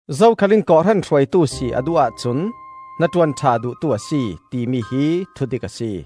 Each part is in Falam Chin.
“Zo khal in kawhhran hruaitu si a duh ahcun hnaṭuan ṭha duhtu a si,” timi hi thudik a si.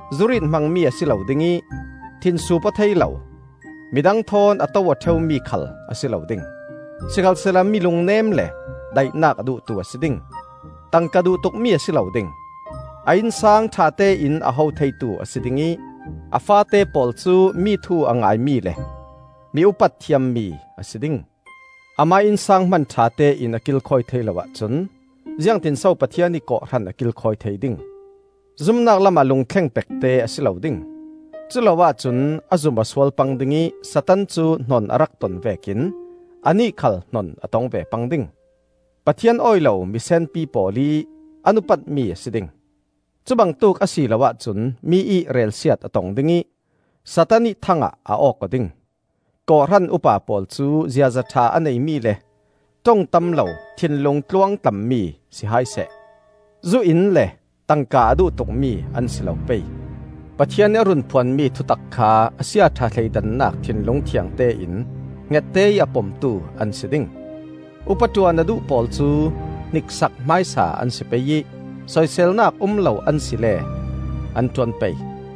Zurit hmangmi a si lo ding ih, thinsuup aw thei lo, midang thawn a to aw ṭheumi khal a si lo ding. Sikhalsehla mi lungnem le daihnak a duhtu a si ding. Tangka duh tukmi a si lo ding. A innsang ṭhatein a ho theitu a si ding ih a faate pawl cu mi thu a ngaimi le mi upat thiammi a si ding. Amah ih innsang hman ṭhatein a kilkhawi thei lo ahcun ziangtinso Pathian ih kawhhran a kilkhawi thei ding. Zumnak lamah lungthleng pekte a si lo ding; culo ahcun a zum aw sual pang ding ih Satan cu hnon a rak ton vekin anih khal hnon a tong ve pang ding. Pathian awi lo misenpi pawl ih an upatmi a si ding; cubangtuk a si lo ahcun mi ih relsiat a tong ding ih Satan ih thang ah a awk aw ding. Kawhhran Upa pawl cu ziaza ṭha a neimi le ṭong tam lo thinlung tluangtlammi si hai seh. Zu in le tangka a duh tukmi an si lo pei. Pathian ih a run phuanmi thutak kha a siaṭha thleidannak thinlung thiangte in hngette ih a pomtu an si ding. Upa ṭuan a duh pawl cu hniksak hmaisa an si pei ih soiselnak um lo an si le an ṭuan pei.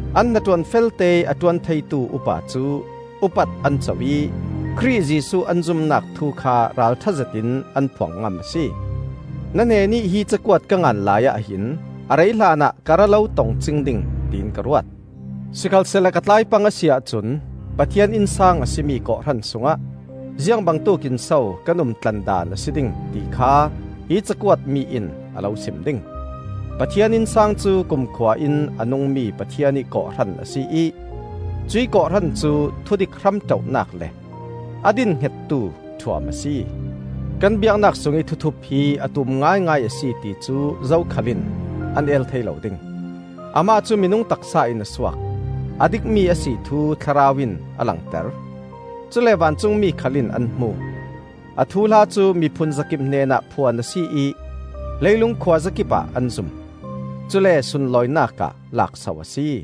An hnaṭuan felteih a ṭuan theitu upa cu upat an co ih Khrih Jesuh an zumnak thu kha ralṭha zetin an phuang ngam a si. Na hnenih hi cakuat ka ngan laiah hin a rei hlanah ka ra lo tong cing ding tiin ka ruat. Sikhalsehla ka tlai pang a si ahcun Pathian innsang a si mi kawhhran sungah ziang bangtuk in so kan umtlandan a si ding, ti kha hi ka cakuatmi in a lo sim ding. Pathian innsang cu kumkhua in a nungmi Pathian ih kawhhran a si ih cuih kawhhran cu thudik hramṭoh-nak le a dinhngettu ṭhuam a si. Kan biaknak sungih thuthup hi a tum ngaingai a si, ti cu zokhal in an el thei lo ding: Amah cu minung taksa in a suak, a dikmi a si thu Thlarau in a langter; Cule vancungmi khal in an hmu; A thuhla cu miphun zakip hnenah phuan a si ih leilung khuazakipah an zum. Cule sunlawinak ah lakso a si.